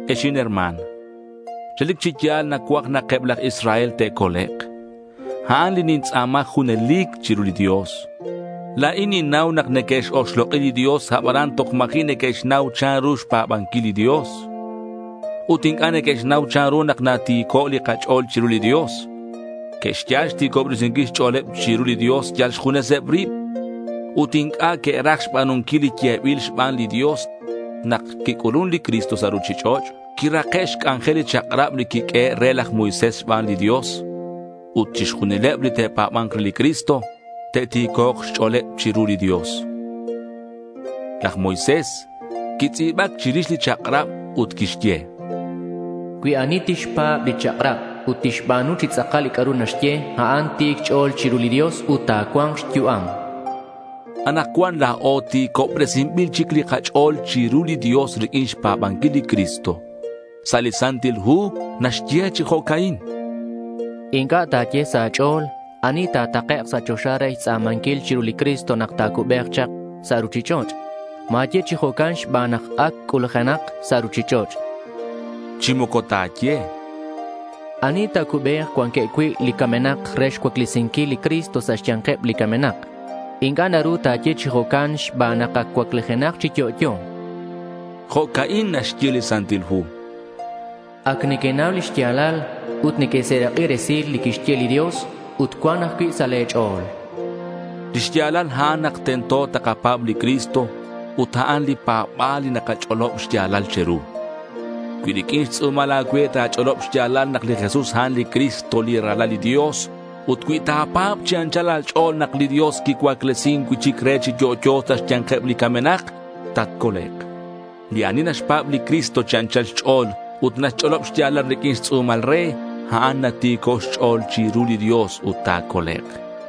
Ex inherma̱n, relic chi ya̱l nacuaj nak eb laj Israel te'colek'. A'an li nintz'a̱ma junelic chiru li Dios. La̱in ninnau nak neque'x-oxlok'i li Dios, abanan toj ma̱ji' neque'xnau chanru xpa̱banquil li Dios. Ut inc'a' neque'xnau chanru nak nati̱co' li kach'o̱l chiru li Dios. Que'xyal xti̱cobresinquil xch'o̱leb chiru li Dios yal xjuneseb rib. Ut inc'a' que'raj xba̱nunquil li yebil xban li Dios. Nak quic'ulun li Cristo sa' ruchich'och', quirake' xc'anjel li chak'rab li quiq'uehe' re laj Moisés xban li Dios. Ut chixjunileb li te'pa̱ba̱nk re li Cristo te'ti̱cok' xch'o̱leb chiru li Dios. Laj Moisés quitz'i̱bac chirix li chak'rab ut quixye: Cui ani tixpa̱b li chak'rab ut tixba̱nu chi tz'akal li c'a'ru naxye, a'an ti̱c xch'o̱l chiru li Dios ut ta̱cua̱nk xyu'am. Anakcuan la̱o ti̱cobresinbil chic li kach'o̱l chiru li Dios riq'uin xpa̱banquil li Cristo. Sa' li Santil Hu naxye chi jo'ca'in: Inc'a' ta̱ye sa' a̱ch'o̱l ¿ani ta̱takek' sa' choxa re xtz'a̱manquil chiru li Cristo nak ta̱cubek chak sa' ruchich'och'? Ma̱ye chi jo'can xban nak ac c'ulujenak sa' ruchich'och'. Chi moco ta̱ye ¿ani ta̱cubek cuanqueb cui' li camenak re xcuaclesinquil li Cristo sa' xya̱nkeb li camenak? Inc'a' naru ta̱ye chi jo'can xban nak ac cuaclijenak chi yo'yo. Jo'ca'in naxye li Santil Hu: Ac nequenau lix ya̱lal ut nequeserak'i resilal li quixye li Dios ut cuan ajcui' sa' le̱ ch'o̱l. Lix ya̱lal a'an nak tento takapa̱b li Cristo ut a'an li pa̱ba̱l li nakach'olob xya̱lal che̱ru. Cui riq'uin xtz'u̱mal a̱cue ta̱ch'olob xya̱lal nak li Jesús a'an li Cristo li Ralal li Dios, ut cui ta̱pa̱b chi anchal a̱ch'o̱l nak li Dios quicuaclesin cui'chic re chi yo'yo sa' xya̱nkeb li camenak, tatcolek'. Li ani naxpa̱b li Cristo chi anchal xch'o̱l ut naxch'olob xya̱lal riq'uin xtz'u̱mal re, a'an nati̱co' xch'o̱l chiru li Dios ut ta̱colek'.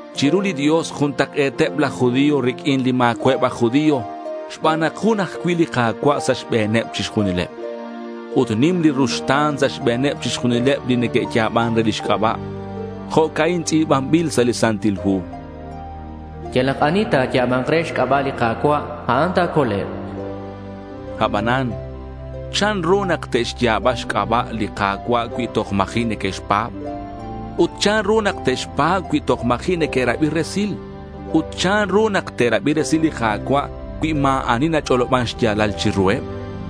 Chiru li Dios juntak'e̱teb laj judío riq'uin li ma̱cua'eb aj judío xban nak jun ajcui' li Ka̱cua' sa' xbe̱neb chixjunileb. Ut nim li ruxta̱n sa' xbe̱neb chixjunileb li neque'ya̱ban re lix c'aba'. Jo'ca'in tz'i̱banbil sa' li Santil Hu: Yalak ani ta̱ya̱ba̱nk re xc'aba' li Ka̱cua', a'an ta̱colek'. Abanan ¿chanru nak te'xya̱ba xc'aba' li Ka̱cua' cui toj ma̱ji' neque'xpa̱b? Ut ¿chanru nak te'xpa̱b cui toj ma̱ji' neque'rabi resil? Ut ¿chanru nak te'rabi resil li Ka̱cua' cui ma̱ ani nach'oloban xya̱lal chiruheb?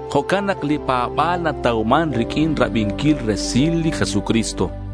Jo'can nak li pa̱ba̱l natauman riq'uin rabinquil resil li Jesucristo.